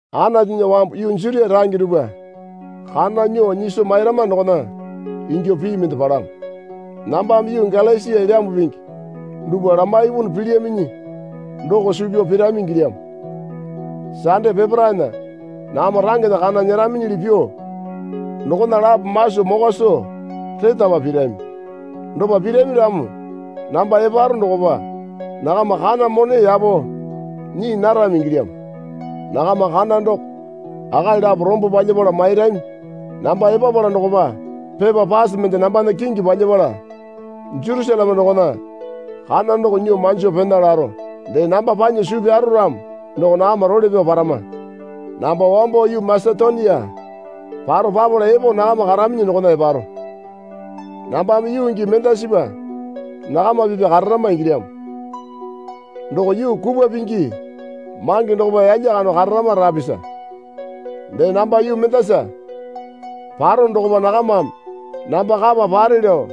Anatunya wambu yuu Jutia range dupwa kana nyuo nyiso mairama dokona ingyuo pii mende palamo. Nambame yuu Galasia Elyambu Pingi dupwa lamaipunu pilyaminyi doko suu pyao pirami ingilyamo. Sande peparaena nakama rangena kana nyeraminyili pyuo dokona lapo maso mokwa soo retapa pirami. Dopa pirami ramo namba eparo dokopa nakama kana mone yapo nyii narami ingilyamo. Nakama kana doko akali lapo rombo palyapala mairami. Namba epapala dokopa pepa pase mende nambana kingi palyapala Jerusaleme dokona kana doko nyuo manjo pena laro. Dee namba panya suu pyaro ramo doko nakama role pyao parama. Namba wambo yuu Masetonia paro papala epo nakama karaminyi dokona eparo. Nambame yuu gii mendasipa nakama pipa kararama ingilyamo. Doko yuu kupwa pingi mange dokopa yalya kando kararama rapisa. Dee namba yuu mendasa parono dokopa nakamame namba kapa pare lao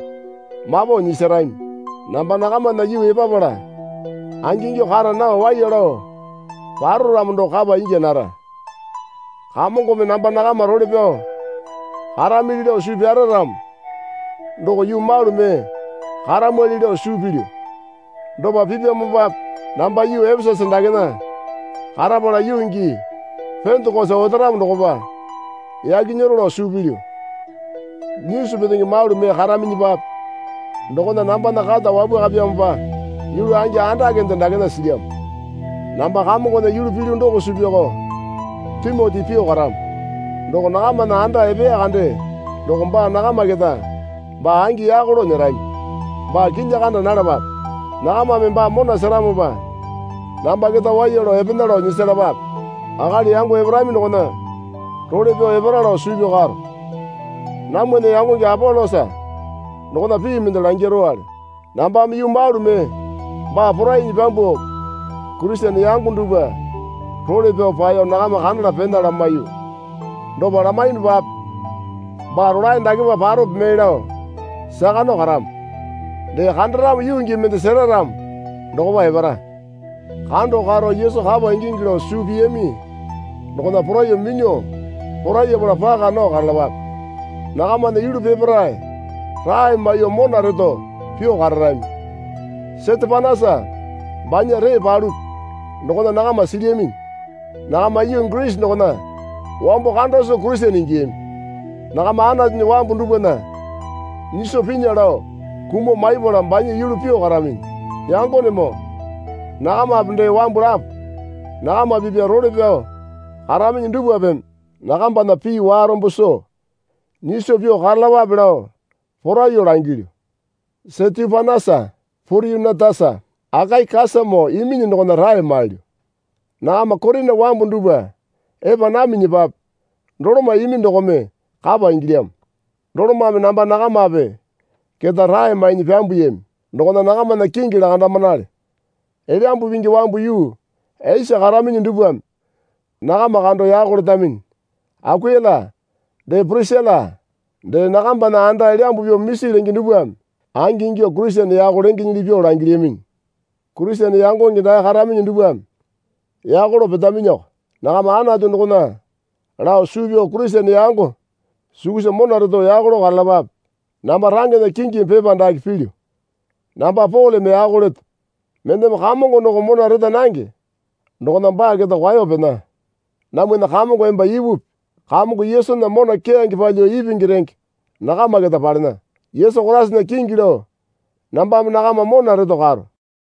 mapo nyisarami. Namba nakamana yuu epapala angingyuo kara nao waiya lao paro ramo doko kapa ingya nara. Kamongome namba nakama role pyao karamili lao suu pyara ramo doko yuu malu mee karamwali lao suu pilyu. Dopa pipyamopape namba yuu Epesasa dakena karapala yuu gii Pendekosa otaramo dokopa yaki nyero lao suu pilyu. Nyisu petenge malu mee karaminyipape dokona nambana kata wapwakapyamopa yulu angi andakende dakena silyamo. Namba Kamongona yulu pilyu doko suu pyaoko Timoti pyuo karamo. Doko nakamana anda epeya kande doko baa nakama keta baa angi yako lao nyerami. Baa kilya kanda nalapape. Nakamame baa mona seramopa namba keta waiya lao epena lao nyisalapape. Akali yango eparami dokona role pyao epara lao suu pyao karo. Namwana yangonge Apolosa dokona pii mende langirowale. Nambame yuu malu mee baa porainyi pyambuo Kurisene yango dupwa role pyao paeyo nakama kandala pena lamaiyu. Dopa lamaiyunupape baa rolae dakepa parope mee lao saka nao karamo. Dee kandaramo yuu gii mende sera ramo dokopa epara. Kando karo Yesu kapa ingingi lao suu piyami dokona poraiyuo minyuo porayapala paka nao karalapape. Nakamana yulu peparae rae maiyuo mona reto pyuo kararami. Setepanasa banya ree palupi dokona nakama silyaminyi. Nakama yuu Girisi dokona wambo kanda soo Kurisene ingiyami. Nakama Anatunya wambu dupwana nyiso pinya lao kumuo maipala banya yulu pyuo karaminyi. Yangonemoo nakamape dee wambu lapo nakama pipya role pyao karaminyi dupwapeme nakambana pii warombo soo nyiso pyuo karalapape lao poraiyuo langilyu. Setepanasa Poryunetasa Akaikasamoo iminyi dokona rae mailyu. Nakama Korina wambu dupwa epa naminyipape doloma imi dokome kapa ingilyamo. Dolomame namba nakamape keta rae mainyi pyambuyami dokona nakamana kingi lakandamanale. Elyambu Pingi wambu yuu Esia karaminyi dupwame nakama kando yako letaminyi. Akuila dee Pirisila dee nakambana anda elyambu pyuo misi lenge dupwame angingyuo Kurisene yako lengenyili pyuo langilyaminyi. Kurisene yangonge dae karaminyi dupwame yako lao petaminyiko. Nakama Anatu dokona lao suu pyao Kurisene yango sukusa mona reto yako lao karalapape. Namba rangena kingimi pepa dake pilyu. Namba Poleme yako leto. Mendeme Kamongo doko mona reta nange dokona baa keta kwao pena. Namwana Kamongo emba ipupi. Kamongo Yesunya mona keyange palyuo ipingi renge nakama keta palena. Yesu Koraisana kingi lao nambame nakama mona reto karo.